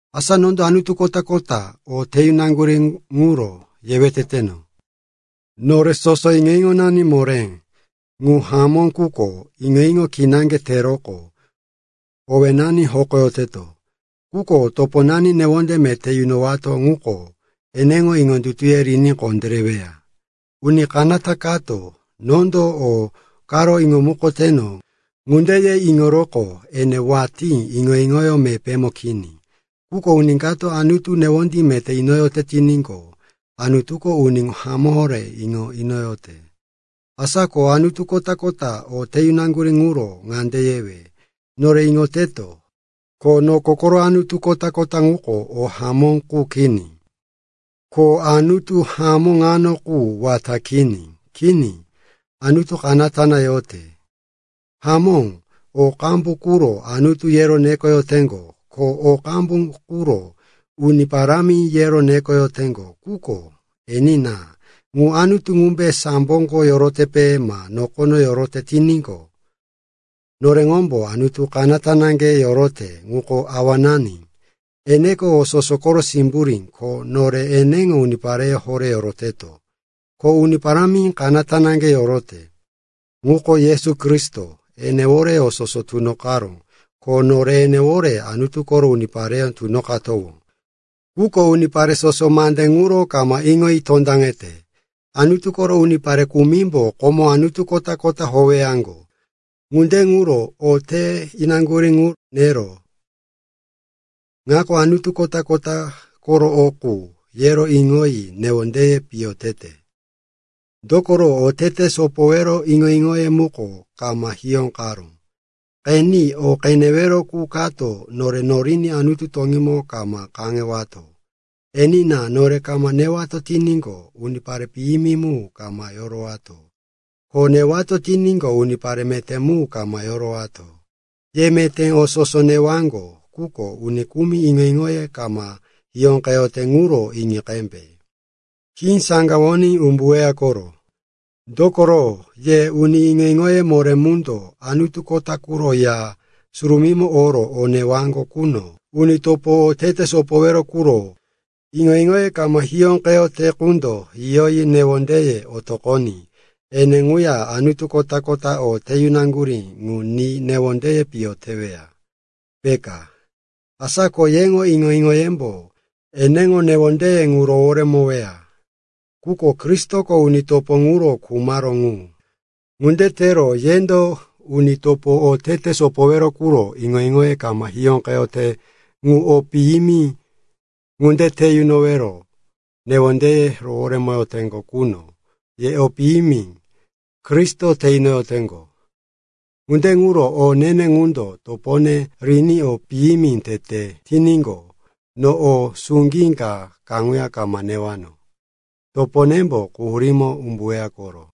Asa nondo anutu kota-kota o te yunaŋgurí ŋuro yewe teteno. Nore soso iŋo-iŋonani moré. Ŋu hamó, quko iŋo-iŋo kinaŋge teroqo owénani hokoyoteto. Quko toponani newonde meté yunowato ŋuko eneŋo iŋondutuye riní kondéreweya. Uni kanata kato, “Nondo o karo iŋomukoteno,” ŋunde ye iŋoroqo ene watí iŋo-iŋoyó mepémo kini. Quko uni kato Anutu newonde meté inoyote tiníqo, Anutuko uni ŋu hamó horé iŋo inoyote. Asa ko anutu kota-kota o te yunaŋgurí ŋuro ŋande yewe. Nore iŋoteto, ko noko koro anutu kota-kota ŋuko o hamó qu kini. Ko anutu hamó ŋano qu wata kini. Kini. Anutu kanata na yote. Hamó, o qambu quro, “anutu,” yero nekoyoteŋgo, ko o qambu quro, “uni parámi,” yero nekoyoteŋgo. Quko enina, ŋu anutu ŋumbe samboko yorotepe ma nokono yorote tiníqo, noreŋomboro Anutu kanata naŋge yorote, ŋuko Awanani. Eneko o soso koro simburí, ko nore eneŋo unipareyó horé yoroteto. Ko Uni Parámi kanata naŋge yorote, ŋuko Yesu Kristo. Enewore o soso tunoqaró, ko nore enewore Anutu koro unipareyó tunoqatowó. Quko unipare soso mande ŋuro kama iŋoyi tondaŋete. Anutu koro unipare kumimbo komo anutu kota-kota howeyaŋgo. Ŋunde ŋuro o te inaŋgurí ŋu nero, ŋako anutu kota koro o qu, yero iŋoyi newondeye piyo tete. Dokoro oteteye sopoyowero iŋo-iŋoye muko kama hiyóqaró. Qeni, o newero qu kato nore noriní Anutu toŋímo kama kaŋewato. Enina, nore kama newato tiníqo, unipare piyimi mu kama yorowato, ko newato tiníqo, unipare meté mu kama yorowato. Ye meté o soso newaŋgo, quko uni kumi iŋo-iŋoye kama hiyóqeyote ŋuro iŋi qembe. Khí saŋgawoní umbuweya koro. Dokoro ye uni iŋo-iŋoye moré mundo anutu kota quro ya surumímo oro o newaŋgo quno, uni topo otete sopowero quro iŋo-iŋoye kama hiyóqeyote qundo yiyoyi newondeye otoqoní ene ŋuya anutu kota-kota o te yunaŋgurí ŋu ni newondeye piyo teweya, peka. Asa ko yeŋo iŋo-iŋoyembo eneŋo newondeye ŋu roworemoweya. Quko Kristoko uni topo ŋuro khumaró ŋu. Ŋunde tero yendo uni topo otete sopowero quro iŋo-iŋoye kama hiyóqeyote ŋu o piyimi ŋunde te yunoro newondeye roworemoteŋgo quno, ye o piyimi Kristo te inoteŋgo. Ŋunde ŋuro o ne-ne ŋundo topone riní o piyimi tete tiníqo, no o suŋgí ka kaŋuya kama newano. Toponembo quhurímo umbuweya koro.